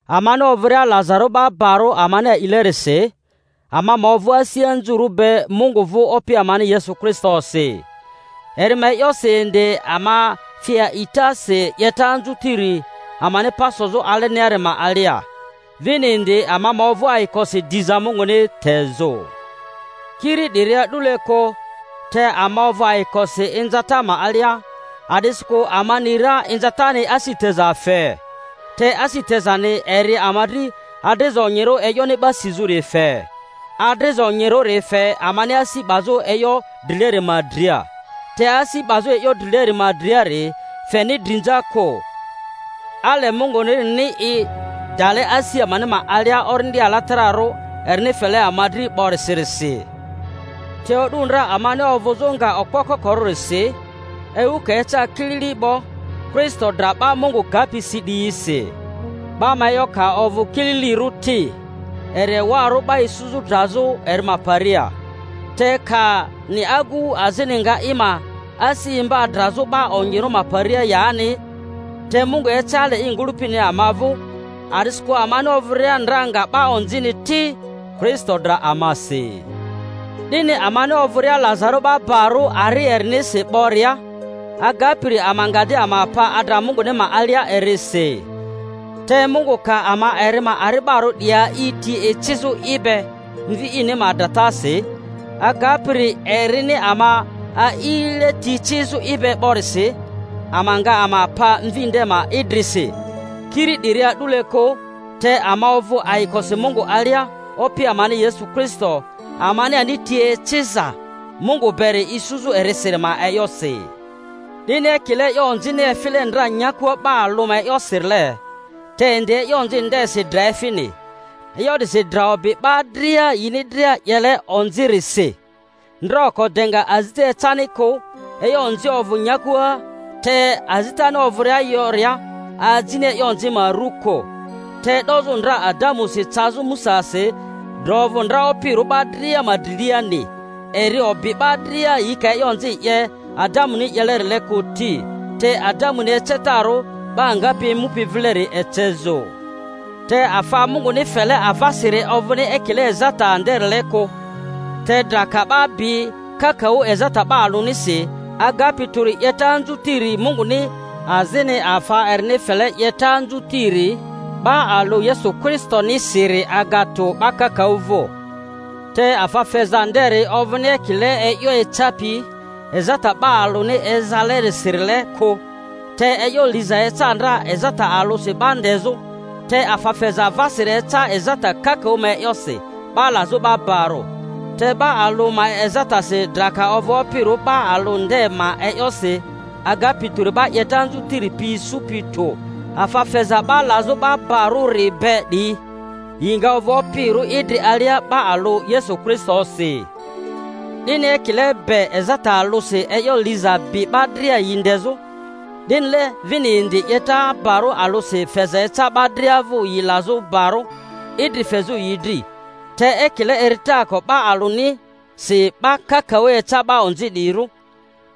Amani ovᴜria lazarᴜ 'ba barᴜ amani a'ilerisi, ama ma ovᴜ asi anzurᴜ be Mungu vᴜ Opi amani Yesu Kristosi. Eri ma e'yosi indi ama fi a'itasi 'yeta anzutiri amani pa sozᴜ aleniari ma alia, vini indi ama ma ovᴜ ayikosi diza Munguni tezᴜ. Kiri 'diri a'dule kᴜ, te ama ovᴜ ayikosi inzata ma alia, a'disikᴜ ama ni ra inzatani asi teza fe, te asi tezani eri ama dri adriza onyirᴜ e'yoni 'ba sizᴜri fe, adriza onyirᴜri fe amani asi 'bazᴜ e'yo drileri ma dria, te asi 'bazᴜ e'yo drileri ma driari feni drinza kᴜ, ale Mungunirini i dale asi amani ma alia Orindi Alatararᴜ erini fele ama dri 'borisirisi. Te o'du ndra amani ovᴜzᴜ nga okpo kokorᴜrisi, ewu ka eca kilili 'bo Kristo dra 'ba Mungu gapi si 'diyisi. 'Ba ma e'yo ka ovᴜ kililirᴜ ti, eri ewarᴜ 'ba isuzᴜ drazᴜ eri ma paria— te kani agu azini nga i ma asi imba drazᴜ 'ba onyirᴜ ma paria yani. Te Mungu ece ale i ngᴜlᴜpini ama vᴜ, a'disikᴜ amani ovᴜria ndra nga 'ba onzini ti, Kristo dra amasi. 'Dini amani ovᴜria lazarᴜ 'ba barᴜ ari erinisi 'boria, agapiri ama nga di ama pa adra Munguni ma alia erisi. Te Mungu ka ama eri ma ari'barᴜ 'diyi a'i ti ecizᴜ i be Mvi ini ma dratasi, agapiri erini ama a'ile ti ecizᴜ i be 'borisi, ama nga ama pa Mvi nde ma idrisi. Kiri 'diri a'dule kᴜ, te ama ovᴜ ayikosi Mungu alia Opi amani Yesu Kristo, amani ani ti eciza Mungu beri isuzᴜ erisiri ma e'yosi. 'Dini ekile e'yo onzini efile ndra nyakua 'ba alᴜ ma e'yosirile, te indi e'yo onzi ndesi dra efini, e'yo 'disi dra obi 'ba dria yini dria 'yele onzirisi ndra oko de azita ecani kᴜ e'yo onzi ovᴜ nyakua, te azitani ovᴜria yoria, ajini e'yo onzi ma ru kᴜ. Te e'dozᴜ ndra Adamusi cazᴜ Musasi dra ovᴜ ndra opirᴜ 'ba dria ma driliani, eri obi 'ba dria yi ka e'yo onzi 'ye Adamuni 'yelerile kᴜ ti, te Adamuni ecetarᴜ 'ba ngapi emupi vileri ecezᴜ. Te afa Munguni fele avasiri ovᴜni ekile ezata nderile kᴜ. Te dra ka 'ba bi kakaᴜ ezata 'ba alᴜnisi, agapi tᴜri 'yeta anzutiri Munguni azini afa erini fele 'yeta anzutiri 'ba alᴜ Yesu Kristonisiri aga tᴜ 'ba kakaᴜ vᴜ. Te afa feza nderi ovᴜni ekile e'yo ecapi ezata 'ba alᴜni ezalerisirile kᴜ. Te e'yo liza eca ndra ezata alᴜsi 'ba ndezᴜ, te afa feza avasiri eca ezata kakaᴜ ma e'yosi 'ba lazᴜ 'ba barᴜ. Te 'ba alᴜ ma ezatasi dra ka ovᴜ opirᴜ 'ba alᴜ nde ma e'yosi, agapi tᴜri 'ba 'yeta anzu-tiri pi isupi tᴜ, afa feza 'ba lazᴜ 'ba barᴜri be 'diyi, yi nga ovᴜ opirᴜ idri alia 'ba alᴜ Yesu Kristosi. 'Dini ekile be ezata alᴜsi e'yo liza bi 'ba dria yi ndezᴜ, 'dinile vini indi 'yeta barᴜ alᴜsi feza eca 'ba dria vᴜ yi lazᴜ barᴜ, idri fezᴜ yi dri. Te ekile eritaako 'ba alᴜnisi 'ba kakaᴜ eca 'ba onzi 'diyirᴜ,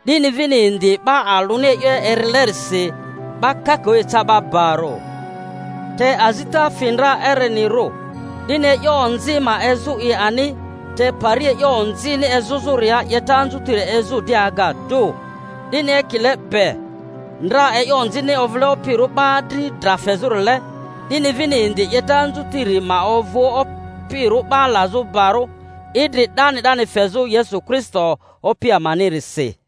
'dini vini indi 'ba alᴜni e'yo erilerisi 'ba kakaᴜ eca 'ba barᴜ. Te azita fi ndra erenirᴜ, 'dini e'yo onzi ma ezu i ani, te pari e'yo onzini ezᴜzᴜria 'yeta anzutiri ezᴜ di aga tᴜ, 'dini ekile be ndra e'yo onzini ovᴜle opirᴜ 'ba dri dra fezᴜrile, 'dini vini indi 'yeta anzutiri ma ovᴜ opirᴜ 'ba lazᴜ barᴜ, idri 'dani 'dani fezᴜ Yesu Kristo Opi amanirisi.